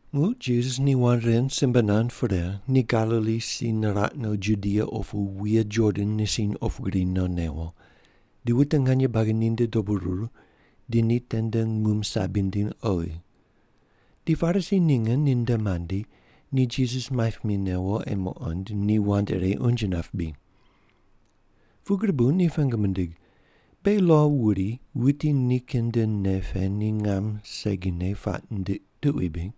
Muq Jisas ni wand ren simbe nand pre, ni Galili si niraq no Judia opu wuye Jordan nisiny opu gri no newo, di wute nganye buagi ninde dobu ruru di ni tende num sabi nindiny oghi. Di Parisi ninge ninde mandi, ni Jisas maip mi newo ei muqond ni wand ire unje nap bri. Pugri bu ni pengu mindig, “Beghi lo wuri wuti nikin nde nei pe ni ngam segine puaq nindiq tuqui bri?”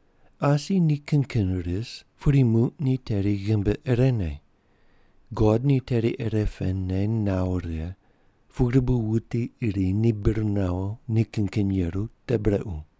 Asi ni kin kin ris pudi muq ni teri ghimbi irene. God ni teri irepene nawo righe, pugri bu wuti iri ni bir nawo ni kin kin yeru te brequ.”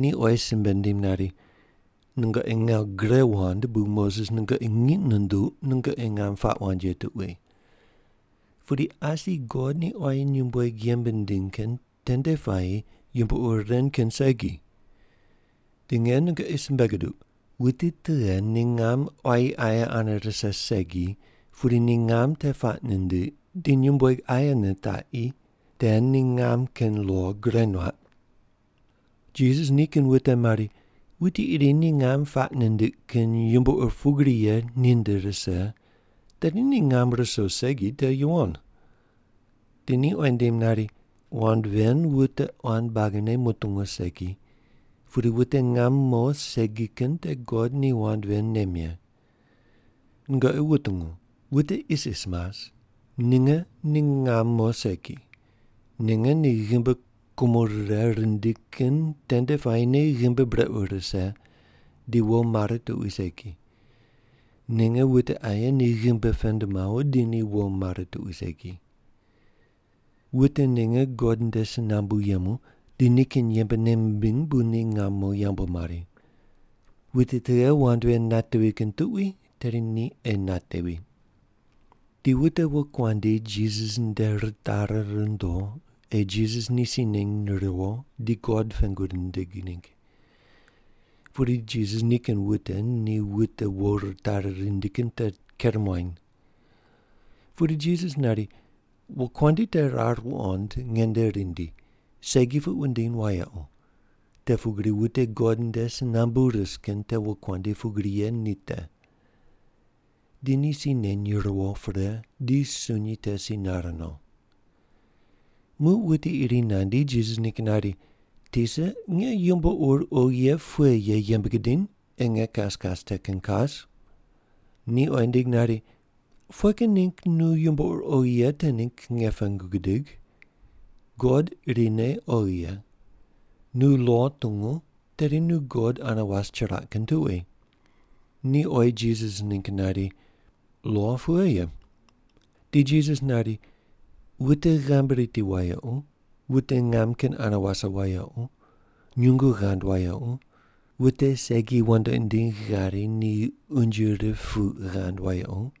Ni oyi simbe nindim nari, “Nungoqi ngawu gre wand bu Moses nungoqi ngiq nunduq nungoqi ngam puaq wand ye tuqui. Pudi asi God ni quayi nyumbueg yembe nindiny kin tende puayi yumbo ur ren kin segi. Di nge nungoqi simbe guduq, wuti tughe ni ngam quayi aye ane rise segi, pudi ni ngam te puaq nindiq di nyumbueg aye nitaqi, te ni ngam kin lo gure nuaq.” Jisas nikin wute mari, “Wuti iri ni ngam puaq nindiq kin yumbo ur pugri ye ninde rise, tedi ni ngam ruso segi te yuwon.” Di ni oyi nindim nari, “Wand ven wute quan buagine mutungu segi, pudi wute ngam mo segi kin te God ni wand ven nem ye. Nungoqi wutungu, wute isis mas, ninge ni ngam mo segi. Ninge ni ghimbi kumo rire rindi kin tende puayine ghimbi brequ rise di wo mare tuqui segi, ninge wute aye ni ghimbi pend mawo di ni wo mare tuqui segi. Wute ninge God nde si nambu yemu di nikin yembe nei mimbiny bu ni ngam mo yambu mari. Wuti tughe wand ven natevi kin tuqui tedi ni ei natevi.” Di wute wokuandi Jisas nde ritari rundo ei Jisas ni si neny riwo di God pengu nindig ningg. Pudi Jisas nikin wute ni wute wo ritari rindi kin te ker muany. Pudi Jisas nari, “Wokuandi te rar wuqond nge nde rindi, segi puq wundiny wayequ, te pugri wute God nde si nambu ris kin te wokuandi pugri ye ni te.” Di ni si neny riwo pre, di sunyi te si nare no. Muq wuti iri nandi Jisas ningg nari, “Tisa, nge yumbo ur oghi ye pughe ye yembe gidiny ei nge kas kas te kin kas?” Ni oyi nindig nari, “Pughe kin ningg nu yumbo ur oghi ye te ningg nge pengu gudigh? God irine oghi ye. Nu lo tungu, tedi nu God ane was chiraq kin tuqui.” Ni oyi Jisas ningg nari, “Lo pughe ye?” Di Jisas nari, “Wute ghamb riti wayequ; wute ngam kin ane wase wayequ; nyungu ghand wayequ; wute segi wandoqi ndiny ghari ni unje rip puq ghand wayequ;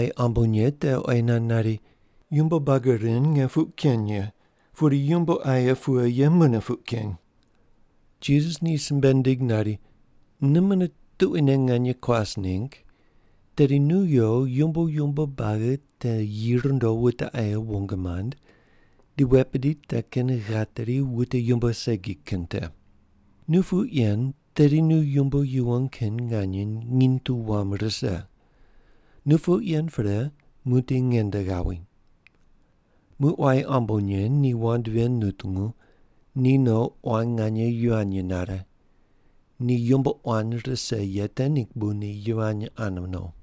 Quayi ambonye te oyi nand nari, “Yumbo buagi ren nge puq ken ye, pudi yumbo aye pughe ye mune puq ken?” Jisas ni simbe nindig nari, “Nu mune tuquine nganye kuas ningg, tedi nu yo yumbo yumbo buagi te yi rundo wute aye wong mand, di wet bidi te kin ghateri wute yumbo segi kin te. Nu puq yen tedi nu yumbo yuwon kin nganye nginy tu wam rise. Nu puq yen pre muqdi nge nde ghawi.” Muq quayi ambonye ni wand ven nutungu, ni no quan nganye yivany nare. Ni yumbo quan rise ye te ningg bu ni yivany ane no.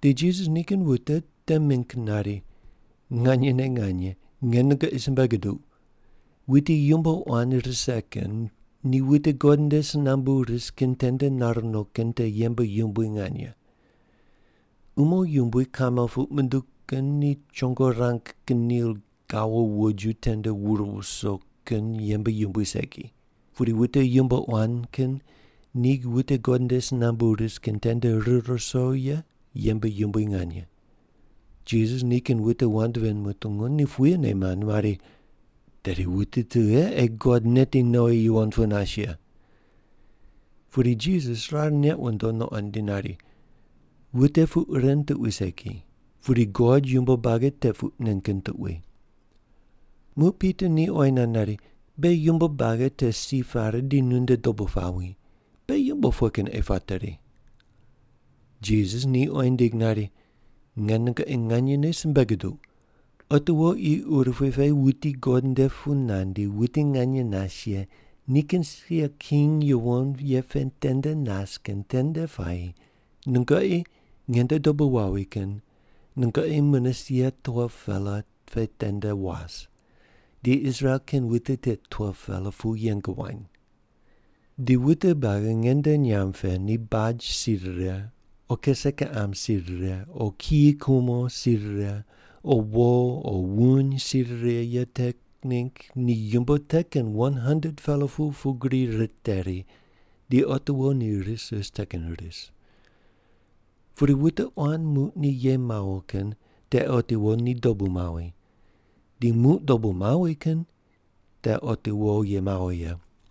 Di Jisas nikin wute te mingg nari, “Nganyene nganye, nge nungoqi simbe guduq, wuti yumbo quan rise kin ni wute God nde si nambu ris kin tende nar no kin te yembe yumbui nganye. Umo yumbui kamel puq munduw kin ni chongo rang kin nil gawo woju tende wur wuso kin yembe yumbui segi, pudi wute yumbo quan kin ni wute God nde si nambu ris kin tende rir ruso ye yembe yumbui nganye.” Jisas nikin wute wand ven mutungu, ni puyene mand mari, “Tedi wuti tughe ei God neti nowi yuwon pu nas ye?” Pudi Jisas rar neq wundo nuqond di nari, “Wute puq ren tuqui segi, pudi God yumbo buagi te puq nen kin tuqui.” Muq Pita ni oyi nand nari, “Beghi yumbo buagi te si pare di nunde dobu pawi. Beghi yumbo pughe kin ei pateri?” Jisas ni oyi nindig nari, “Nge nungoqi nganyene simbe guduq, otiwo qi urupui pe wuti God nde pu nandi wuti nganye nas ye nikin sia king yuwon ye pe tende nas kin tende puayi nungoqi, nge nde dobu wawi kin, nungoqi mune sia 12-pela pe tende was, di Israel kin wute tit 12-pela pu yeng wany. Di wute buagi nge nde nyamb pe ni baj si rire o kise kiqam si rire o kiyi kumo si rire o wo o wuny si rire ye te ningg ni yumbo te kin 100-pela pu pugri riteri di otiwo ni ris ris te kin ris. Pudi wute quan muq ni ye mawo kin te otiwo ni dobu mawi, di muq dobu mawi kin te otiwo ye mawo ye.”